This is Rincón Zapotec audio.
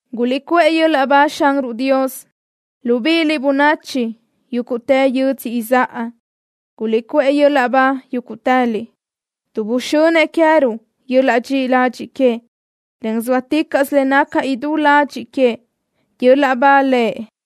¡Guliʼcuʼë yöl-laʼ ba Xanruʼ Dios, libíʼiliʼ, bönachi yúguʼtë yödzö izáʼa! ¡Guliʼcuʼë yöl-laʼ ba yúguʼtëliʼ, tuʼ buxönëʼ queë́ruʼ yöl-laʼ dxiʼi ladxiʼ queëʼ, en zóaticaʼsö le naca idú ladxiʼ queëʼ! ¡Yöl-laʼ ba Lëʼ!